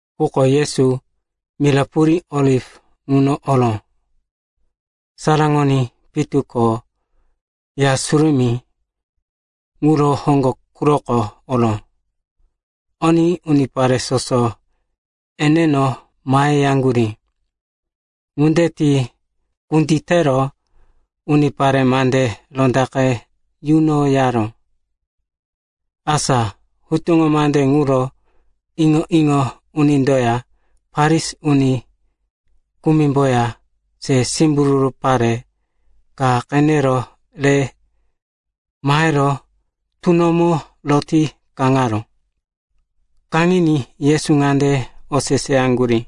Quko Yesu mira purí Oliv ŋuno oró. Saraŋoní pitu ko Ya Surumí ŋuro hoŋgo quroko oró. Oní unipare soso eneno maheyaŋgurí. Ŋunde ti kunditero unipare mande rondaqe yunoyaró. Asa hutuŋo mande ŋuro iŋo-iŋo unindoya Farisi uni kumimboya se simbururu pare ka qenero re mahero tunomo roti kaŋaró. Kaŋiní Yesu ŋande oseseyaŋgurí,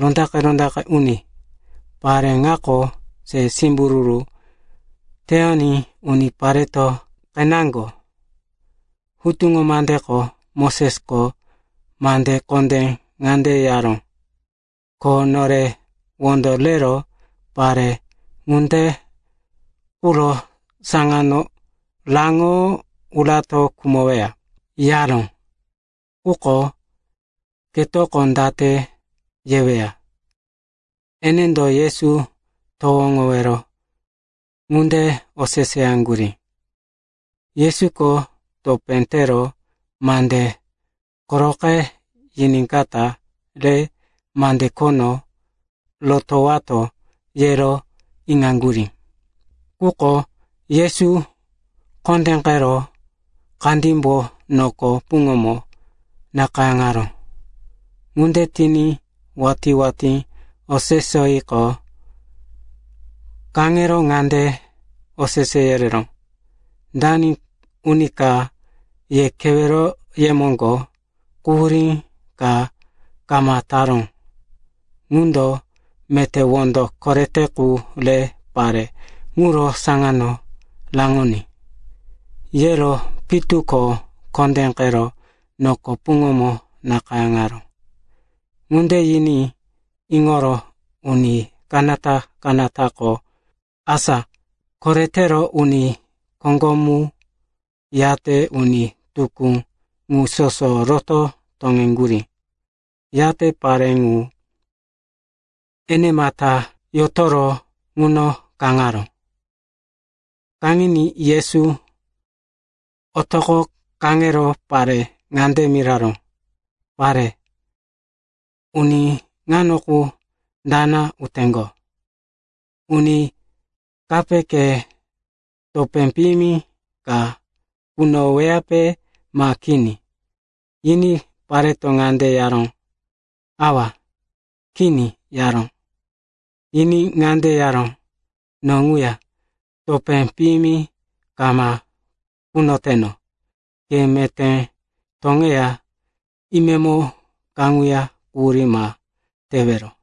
“Rondaqe-rondaqe uni, pare ŋako se simbururu teyoní unipareto qeneŋgo. Hutuŋo mandeko Mosesko mande kondé ŋande yaró, ko nore wondo rero pare ŋunde quro saŋano raŋo urato khumoweya, yaró. Quko ketoko date yeweya?” Enendo Yesu towoŋowero ŋunde oseseyaŋgurí. Yesuko topé tero mande koroqe yiníkata re mande khono rotowato, yero iŋaŋgurí. Quko Yesu kondéqero kandímbo noko puŋomo nakayáŋaró. Ŋunde tiní watí-watí oseseyiqo, kaŋero ŋande osese yereró, “Dani uni ka ye keweroye moŋgo quhurí ka kama taró, ŋundo meté wondo korete qu re pare ŋuro saŋano raŋoní.” Yero pitu ko kondéqero noko puŋomo nakayáŋaró. Ŋunde yiní iŋoro uni kanata-kanatako, asa koretero uni koŋgomu yate uni tukú ŋu soso roto toŋeŋgurí. Yate pare ŋu enemata yotoro ŋuno kaŋaró. Kaŋiní Yesu otoqo kaŋero pare ŋande miraró, “Pare, uni ŋano qu dana uteŋgo? Uni kape ke topé piyimi ka kunoweyape ma kini?” Yiní pareto ŋande yaró, “Awa, kini,” yaró. Yiní ŋande yaró, “No ŋuya topé piyimi kama kunoteno. Ke meté toŋeya imemo kaŋuya quhurí ma tewero.”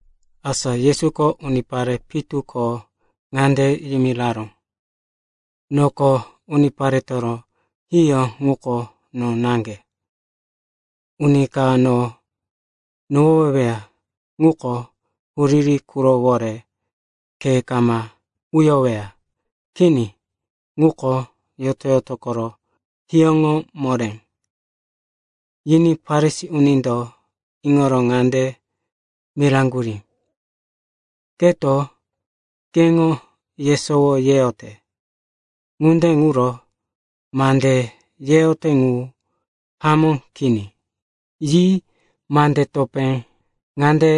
Asa Yesuko unipare pitu ko ŋande yimiraró, “Noko uniparetoro hiyó ŋuko no naŋge. Uni ka no nohoweweya ŋuko huriri qurowore khe kama uyoweya. Kini. Ŋuko yoto-yoto koro hiyóŋo moré.” Yiní Farisi unindo iŋoro ŋande miraŋgurí, “Keto keŋo yesowo yeyote. Ŋunde ŋuro mande yeyote ŋu hamó kini.” Yi mande topé ŋande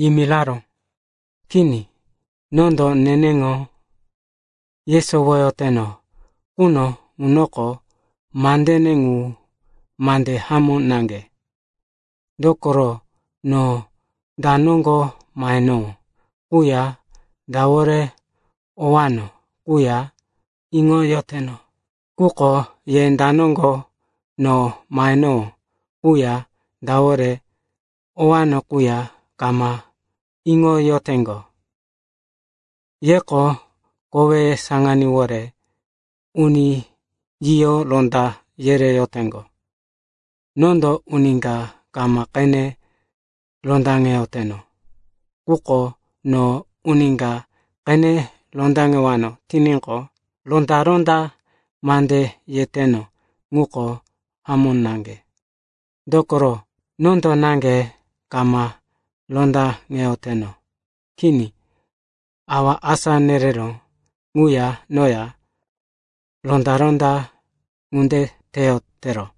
yimiraró, “Kini, nondo neneŋo yesowoyoteno quno ŋunoko mandene ŋu mande hamó naŋge. Dokoro no da noŋgo mahenowó quya dawore owano quya iŋoyoteno. Quko ye da noŋgo no mahenowó quya dawore owano quya kama iŋoyoteŋgo. Yeko koweye saŋaníwore uni yiyo ronda yereyoteŋgo. Nondo uni ka kama qene rondaŋeyoteno. Quko no uni ka qene rondaŋewano tiníqo, ronda-ronda mande yeteno ŋuko hamó naŋge. Dokoro, nondo naŋge kama rondaŋeyoteno. Kini. Awa asá nereró ŋuya noya ronda-ronda ŋunde teyotero.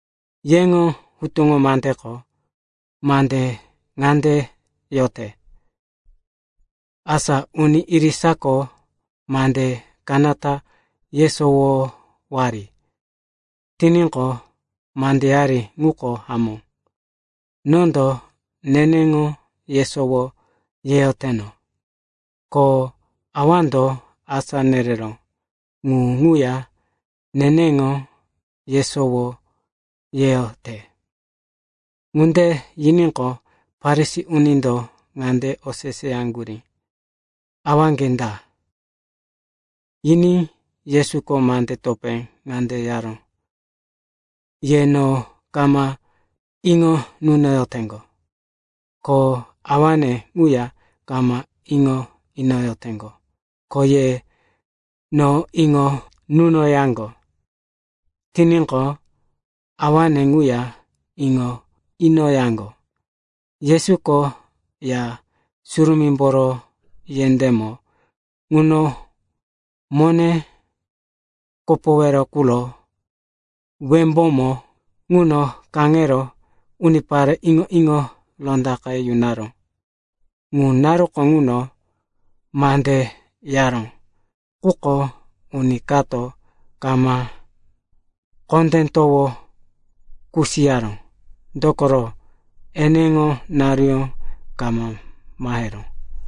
Yeŋo hutuŋo mandeko mande ŋande yote, asa uni irisako mande kanata yesowowari tiníqo, mandeyari ŋuko hamó. Nondo neneŋo yesowo yeyoteno, ko Awando asá nereró ŋu ŋuya neneŋo yesowo yeyote.” Ŋunde yiníqo, Farisi unindo ŋande oseseyaŋgurí, “Awaŋge da?” Yiní Yesuko mande topé ŋande yaró, “Ye no kama iŋo nunoyoteŋgo, ko Awane ŋuya kama iŋo inoyoteŋgo. Ko ye no iŋo nunoyaŋgo tiníqo, Awane ŋuya iŋo inoyaŋgo.” Yesuko Ya Surumímboro yendémo ŋuno mone kopowero quro wembómo ŋuno kaŋero unipare iŋo-iŋo rondaqe yunaró. Ŋu naruko ŋuno mande yaró, quko uni kato kama kondé towo kusiyaró, dokoro, eneŋo naruyó kama maheró.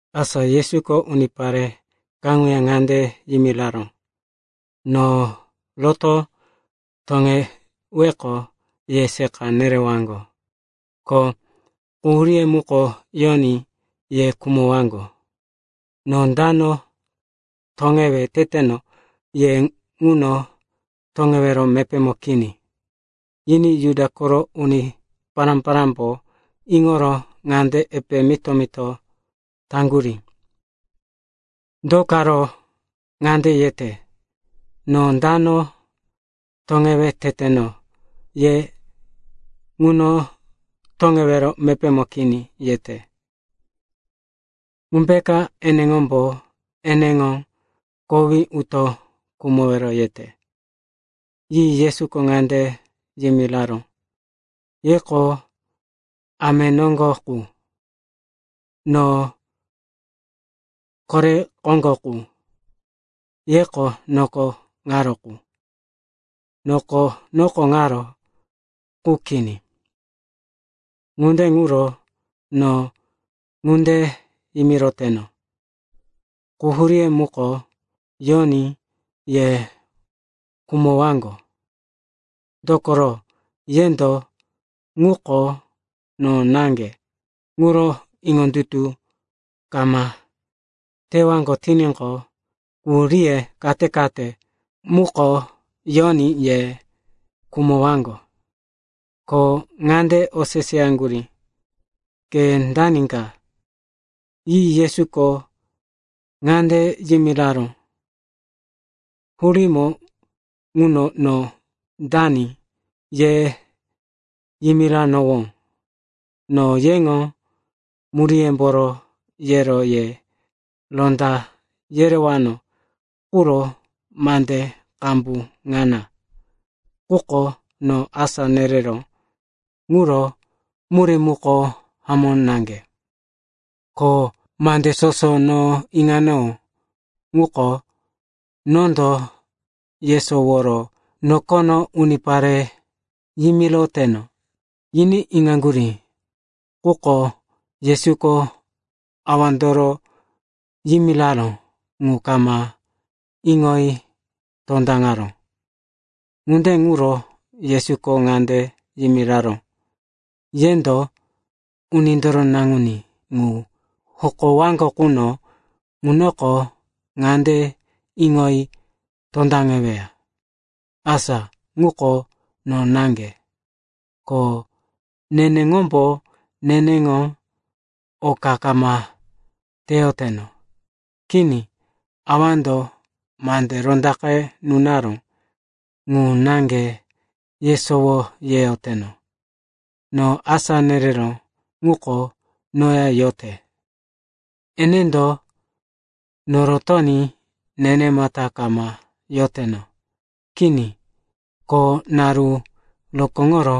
Asa Yesuko unipare kaŋuya ŋande yimiraró, “No roto toŋeweqo, ye seqa nerewaŋgo. Ko quhuríye muko yoní ye khumowaŋgo. No dano toŋewe teteno ye ŋuno toŋewero mepémo kini.” Yiní Juda koro uni pará-parámbo iŋoro ŋande epe mito-mito taŋgurí, “Do karo ŋande yete, ‘No dano toŋewe teteno ye ŋuno toŋewero mepémo kini,’ yete? Ŋumbeka eneŋombo eneŋo kowí uto khumowero yete?” Yi Yesuko ŋande yimiraró, “Yeko ame noŋgo qu; no kore koŋgo qu. Yeko noko ŋaro qu; noko noko ŋaro qu kini. Ŋunde ŋuro no ŋunde yimiroteno, quhuríye muko yoní ye khumowaŋgo. Dokoro yendo, ŋuko no naŋge, ŋuro iŋondutu kama tewaŋgo tiníqo, quhuríye kate-kate muko yoní ye khumowaŋgo.” Ko ŋande oseseyaŋgurí, “Ke dani ka?” Yi Yesuko ŋande yimiraró, “Hurímo ŋuno no dani ye yimiranowó. No yeŋo muríyemboro yero ye ronda yerewano quro mande qambu ŋana. Quko no asá nereró ŋuro murí muko hamó naŋge. Ko mande soso no iŋanowó ŋuko, nondo yesoworo nokono unipare yimiroteno.” Yiní iŋaŋgurí, quko Yesuko Awandoro yimiraró ŋu kama iŋoyi tondaŋaró. Ŋunde ŋuro Yesuko ŋande yimiraró, “Yendo Unindoro Naŋuní ŋu hokowaŋgo quno ŋunoko ŋande iŋoyi tondaŋeweya, asa ŋuko no naŋge, ko neneŋombo neneŋo oka kama teyoteno. Kini, Awando mande rondaqe nunaró ŋu naŋge yesowo yeyoteno. No asá nereró ŋuko noya yote. Enendo norotoní nenemata kama yoteno. Kini. Ko naru rokóŋoro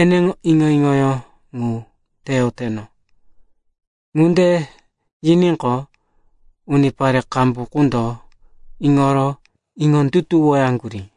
eneŋo iŋo-iŋoyó ŋu teyoteno.” Ŋunde yiníqo, unipare qambu qundo iŋoro iŋondutuwoyaŋgurí.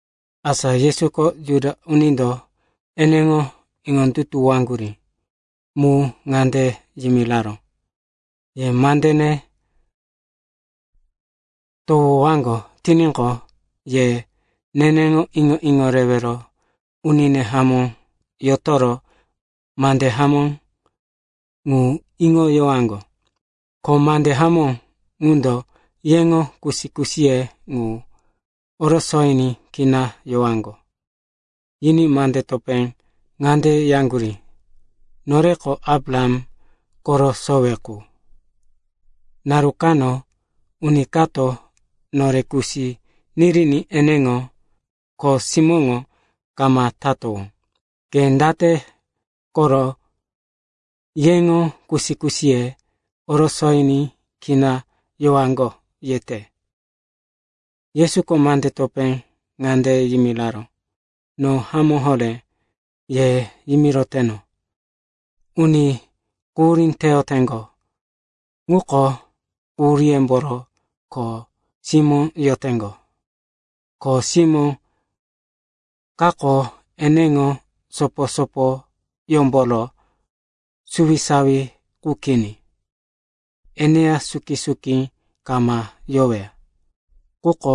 Asa Yesuko Juda unindo eneŋo iŋondutuwoyaŋgurí mu ŋande yimiraró, “Ye mandene towowaŋgo tiníqo, ye neneŋo iŋo-iŋo rewero unine hamó yotoro mande hamó ŋu iŋoyowaŋgo. Ko mande hamó ŋundo yeŋo kusi-kusiye ŋu orosoyiní kina yowaŋgo.” Yiní mande topé ŋande yaŋgurí, “Noreko Abraham koro sowe qu. Naru kano uni kato nore kusi niriní eneŋo kho simóŋo kama tatowó. Ke date koro, yeŋo kusi-kusiye orosoyiní kina yowaŋgo, yete?” Yesuko mande topé ŋande yimiraró, “No hamó horé ye yimiroteno, uni quhurí teyoteŋgo ŋuko quhuríyómboro kho simó yoteŋgo. Kho simó kako eneŋo sopo-sopoyómboro suwisawi qu kini, eneya suki-suki kama yoweya. Quko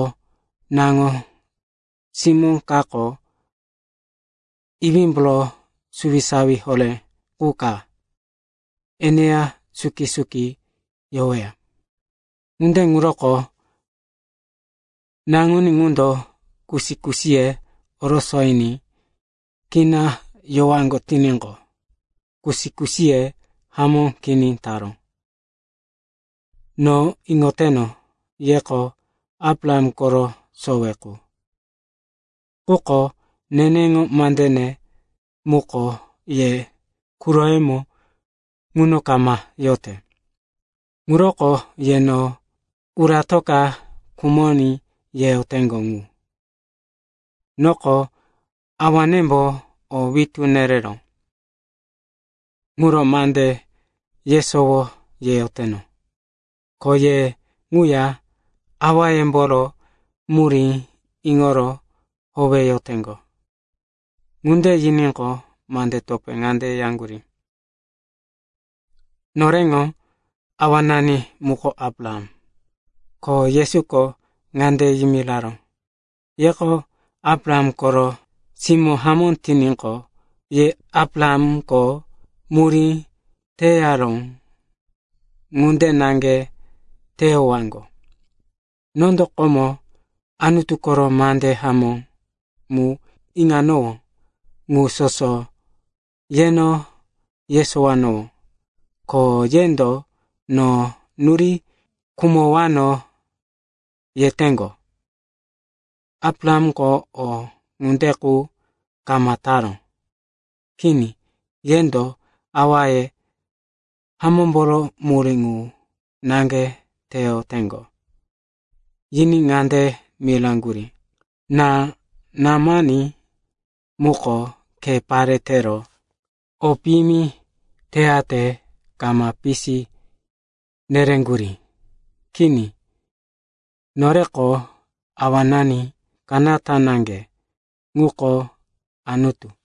naŋo-simó kako iwímboro suwisawi horé qu ka, eneya suki-suki yoweya. Ŋunde ŋuroko Naŋuní ŋundo kusi-kusiye orosoyiní kina yowaŋgo tiníqo, kusi-kusiye hamó kini taró. No iŋoteno, yeko Abraham koro sowe qu. Quko neneŋo mandene muko ye quroyemo ŋuna kama yote. Ŋuroko ye no uratoka khumoní yeyoteŋgo ŋu. Noko Awanembo o witú nereró ŋuro mande yesowo yeyoteno. Ko ye ŋuya awayemboro murí iŋoro howeyoteŋgo.” Ŋunde yiníqo, mande topé ŋande yaŋgurí, “Noreŋo awanani muko Abraham.” Ko Yesuko ŋande yimiraró, “Yeko Abraham koro simó hamó tiníqo, ye Abrahamko murí teyaró ŋunde naŋge teyowaŋgo. Nondo komo Anutu koro mande hamó mu iŋanowó ŋu soso yeno yesowanowó. Ko yendo no nuri khumowano yeteŋgo. Abrahamko o ŋunde qu kama taró. Kini, yendo awaye hamómboro murí qu naŋge teyoteŋgo.” Yiní ŋande miraŋgurí, “Ná-námani muko khe pare tero o piyimi teyate kama pisi nereŋgurí. Kini. Noreko Awanani kanata naŋge, ŋuko Anutu.”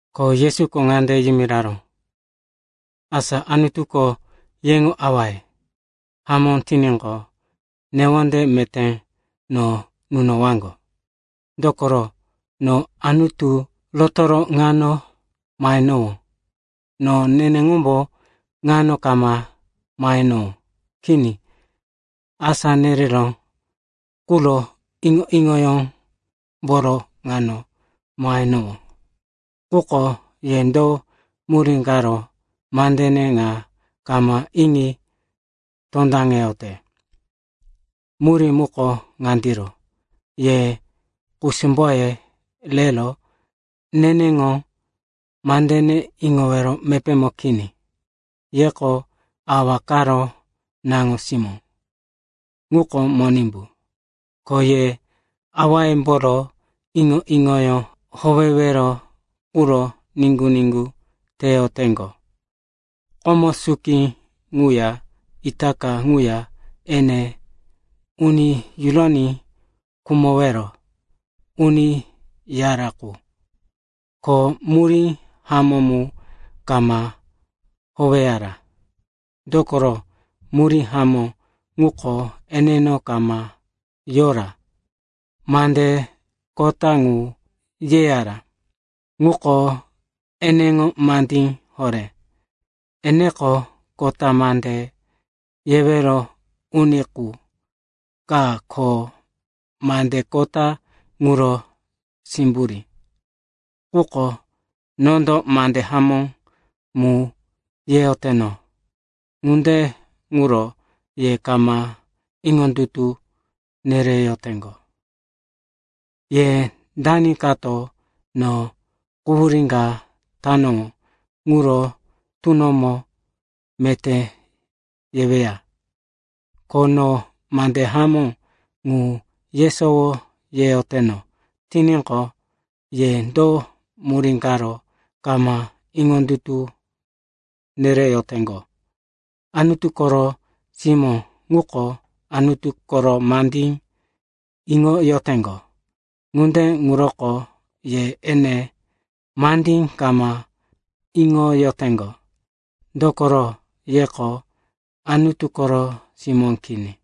Ko Yesuko ŋande yimiraró, “Asa Anutuko yeŋo Awaye hamó tiníqo, newonde meté no nunowaŋgo, dokoro, no Anutu rotoro ŋano mahenowó. No neneŋombo ŋano kama mahenowó. Kini. Asá nereró quro iŋo-iŋoyómboro ŋano mahenowó. Quko ye do murí karo mandene ŋa kama iŋi tondaŋeyote? Murí muko ŋandiro, ye kusumboye rero neneŋo mandene iŋowero mepémo kini. Yeko awa karo naŋo-simó, ŋuko Monimbu. Ko ye awayemboro iŋo-iŋoyó howewero quro niŋgu-niŋgu teyoteŋgo. Komo suki ŋuya itaka ŋuya ene uni yuroní khumowero uni yara qu. Ko murí hamó mu kama howeyara, dokoro, murí hamó ŋuko eneno kama yora. Mande kota ŋu yeyara, ŋuko eneŋo mandí horé. Eneko kota mande yewero uni qu ka ko mande kota ŋuro simburí. Quko nondo mande hamó mu yeyoteno, ŋunde ŋuro ye kama iŋondutu nereyoteŋgo. Ye dani kato no quhurí ka tanowó ŋuro tunomo meté yeweya? Ko no mande hamó ŋu yesowo yeyoteno tiníqo, ye do murí karo kama iŋondutu nereyoteŋgo? Anutu koro simó ŋuko Anutu koro mandí iŋoyoteŋgo. Ŋunde ŋuroko ye ene mandí kama iŋoyoteŋgo, dokoro yeko Anutu koro simó kini.”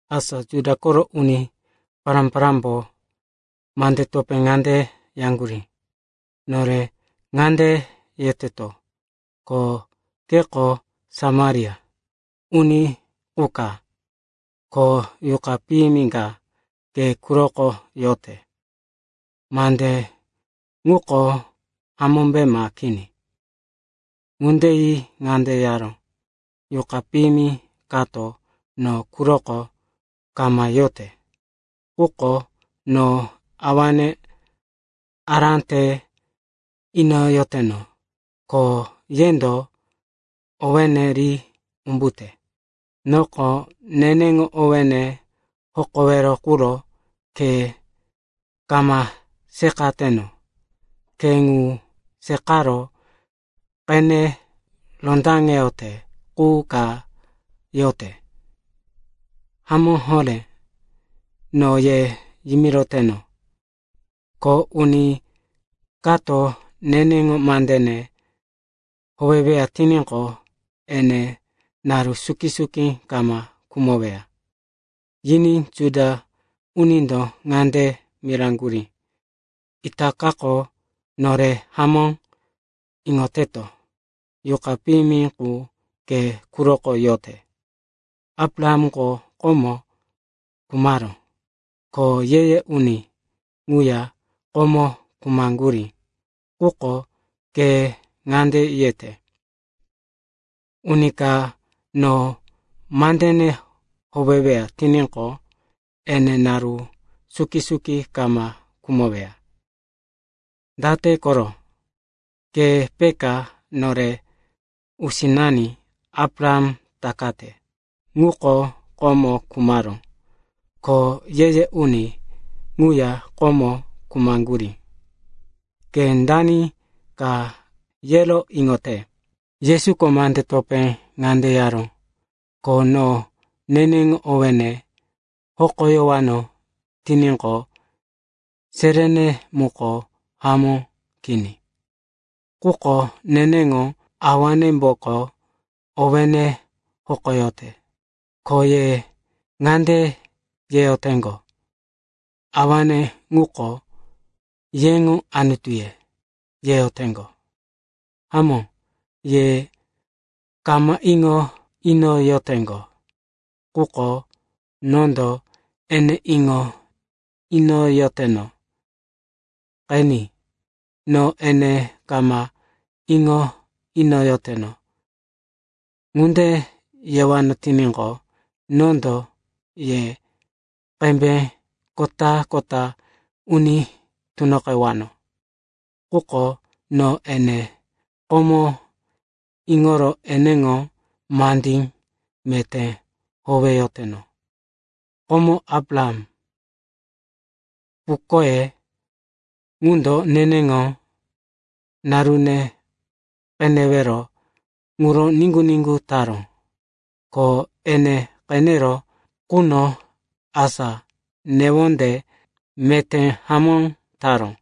Asa Juda koro uni pará-parámbo mande topé ŋande yaŋgurí, “Nore ŋande yeteto, ko keko Samaria uni qu ka, ko yuqa piyimi ka ke quroko yote. Mande ŋuko hamómbe ma kini?” Ŋunde yi ŋande yaró, “Yuqa piyimi kato no quroko kama yote. Quko no Awane ará te inoyoteno, ko yendo owéne ri umbute. Noko neneŋo owéne hokowero quro khe kama seqateno. Khe ŋu seqaro qene rondaŋeyote qu ka yote. Hamó horé no ye yimiroteno, ko uni kato neneŋo mandene howeweya tiníqo, ene naru suki-suki kama khumoweya.” Yiní Juda unindo ŋande miraŋgurí, “Itakako nore hamó iŋoteto, yuqa piyimi qu ke quroko yote. Abrahamko komo khumaró, ko ye-ye uni ŋuya komo khumaŋgurí. Quko ke ŋande yete, ‘Uni ka no mandene howeweya tiníqo, ene naru suki-suki kama khumoweya.’ Date koro? Ke peka nore usinani Abraham takate? Ŋuko komo khumaró. Ko ye-ye uni ŋuya komo khumaŋgurí. Ke dani ka yero iŋote?” Yesuko mande topé ŋande yaró, “Ko no neneŋo owéne hokoyowano tiníqo, seréne muko hamó kini. Quko neneŋo Awanemboko owéne hokoyote. Ko ye ŋande yeyoteŋgo, Awane ŋuko yeŋo Anutuye, yeyoteŋgo. Hamó, ye kama iŋo inoyoteŋgo, quko nondo ene iŋo inoyoteno. Qeni, ‘No ene kama iŋo inoyoteno,’ ŋunde yewano tiníqo, nondo ye qembe kota-kota uni tunoqewano. Quko no ene komo iŋoro eneŋo mandí meté howeyoteno. Komo Abraham, pukoye ŋundo neneŋo narune qenewero ŋuro niŋgu-niŋgu taró. Ko ene qeneró quno, asa newonde meté hamó taró.”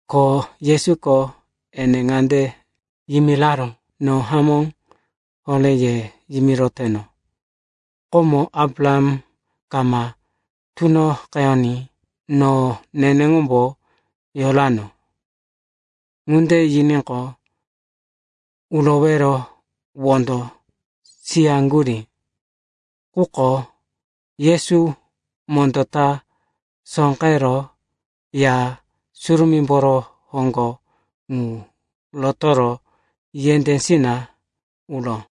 Ko Yesuko ene ŋande yimiraró, “No hamó horé ye yimiroteno, komo Abraham kama tunoqeyoní, no neneŋombo yorano.” Ŋunde yiníqo, urowero wondo siyaŋgurí. Quko Yesu mondó ta sóqero Ya Surumímboro hoŋgo ŋu rotoro yendésina uró.